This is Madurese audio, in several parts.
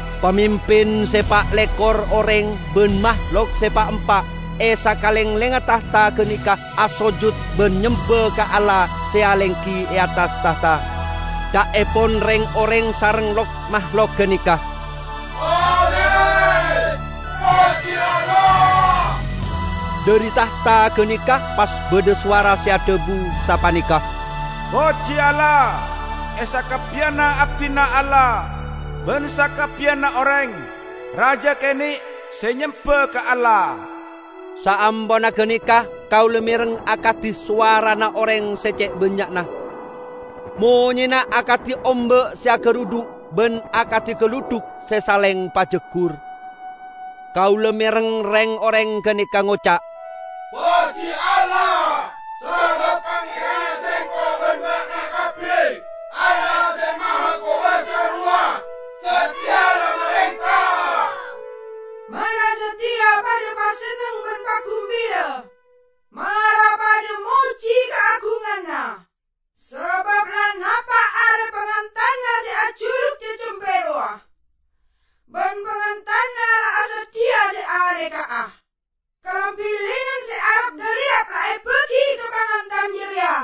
Pamimpin se pa' lekor oreng ban mahlok se pa'-empa' e sakalenglengnga tahta ganeka asojut ban nyemba ka Allah se alenggi e attas tahta. Ca'epon reng-oreng sareng lok-mahlok ganeka, "Amin! Poji Allah!" Dhari tahta ganeka pas badha sowara se dhabu sapaneka, "Poji Allah, e sakabbiyanna abdina Allah, ban sakabbiyanna oreng -- raja kene' -- se nyemba ka Allah!" Saamponna ganeka kaula mereng akadi sowarana oreng se ce' bannya'na; monyena akadi omba' se agarudhu' ban akadi galudhuk se saleng pajaggur. Kaula mereng reng-oreng ganeka ngoca', "Poji Allah! Sabab Pangeranna sengko' ban ba'na kabbi, Allah Se Mahakobasa rowa, sateya la marenta! Mara sateya padha pasenneng ban pagumbira; mara padha moji kaagunganna! Sabab la napa' are pangantanna se ajuluk Cacempe rowa, ban pangantanna la asadhiya se aneka'a. Kalambi linen se arap-galirap la ebagi ka pangantan jareya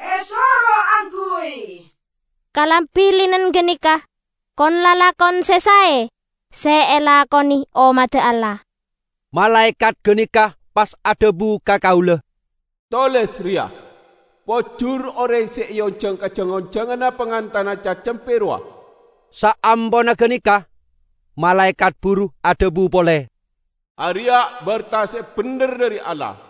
esoro angguy." (Kalambi linen ganeka kon-lalakon se sae se elakone ommadda Allah.) Malaekat ganeka pas adhabu ka kaula, "Toles reya: 'Pojur oreng se eonjang ka jang-onjanganna pangantanna Cacempe rowa.' " Saamponna ganeka, malaekat buru adhabu pole, "Areya' berta se bendher dhari Allah."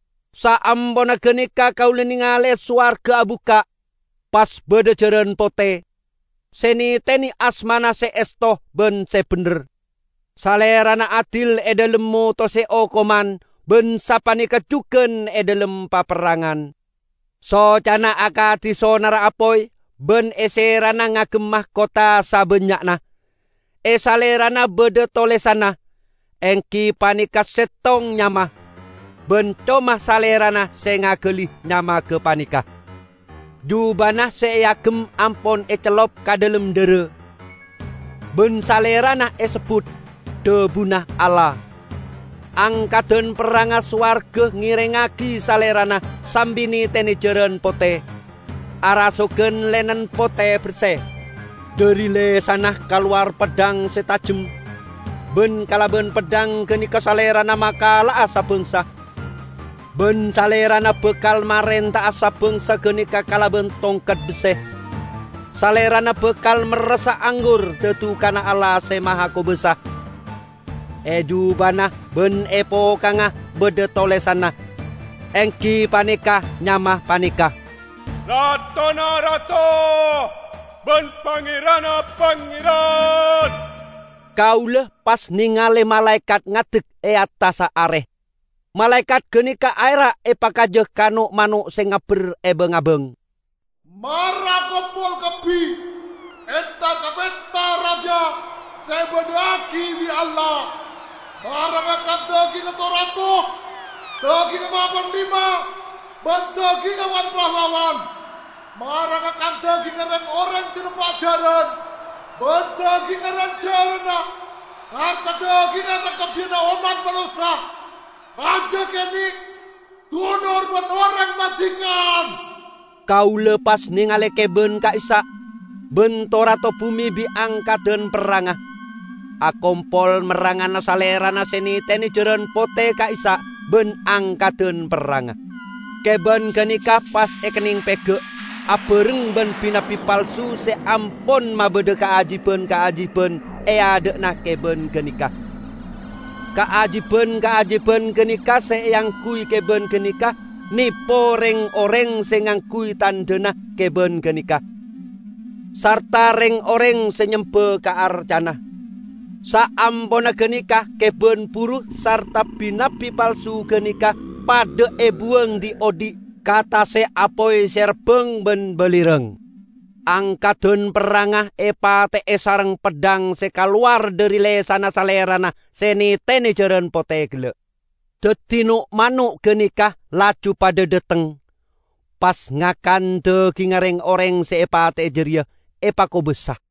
Saamponna ganeka kaula nengale sowarga abukka', pas badha jaran pote. Se netene asmana Se Esto ban Se Bendher. Salerana adil e dhalem motose okoman ban sapaneka jugan e dhalem paperrangan. Socana akadi sonarra apoy ban e serana ngagem makotha sabannya'na. E Salerana badha tolesanna, enggi paneka settong nyama; ban coma Salerana se ngagali nyama gapaneka. Jubana se eagem ampon ecellup ka dhalem dhara. Ban Salerana esebbut "Dhabuna Allah". Angkadan perrangnga sowarga ngerengngagi Salerana sambi netene jaran pote, arasogan linen pote berse. Dhari lesanna kalowar peddhang se tajem, ban kalaban peddhang ganeka Salerana makala'a sa-bangsa, ban Salerana bakal marenta'a sa-bangsa ganeka kalaban tongket besse. Salerana bakal merressa anggur dadukanna Allah Se Mahakobasa. E jubana ban e pokangnga badha tolesanna, enggi paneka nyama paneka, "Ratona rato, ban Pangeranna pangeran." Kaula pas nengale malaekat ngadek e attassa are. Malaekat ganeka aera' epakaja ka no'-mano' se ngabber e bang-abang, "Mara akompol kabbi entar ka pesta raja se ebadha'agi bi' Allah! Mara ngakan dagingnga to-rato, dagingnga ma-panglima ban dagingnga wan-pahlawan; mara ngakan dagingnga reng-oreng se nompa' jaran ban dagingnga ran-jaranna sarta dagingnga sakabbiyanna ommat manossa, raja kene', dunor ban oreng mardikan!" Kaula pas nengale keban ka'issa', ban to-rato bume bi' angkadan perrangnga, akompol merrangana Salerana se netene jaran pote ka'issa' ban angkadan perrangnga. Keban ganeka pas ekenneng pega' abareng ban bi-nabbi palsu se ampon mabadha kaajiban-kaajiban e adha'na keban ganeka. (Kaajiban-kaajiban ganeka se eangguy keban ganeka nepo reng-oreng se ngangguy tandhana keban ganeka, sarta reng-oreng se nyemba ka arcana.) Saamponna ganeka keban buru sarta bi-nabbi palsu ganeka padha ebuwang dhi'-odhi' ka tase' apoy se rabbang ban balirang. Angkadan perrangnga epate'e sareng peddhang se kalowar dhari lesanna Salerana se netene jaran pote gella'. Daddi no'-mano' ganeka laju padha dhateng, pas ngakan dagingnga reng-oreng se epate'e jareya epakobassa.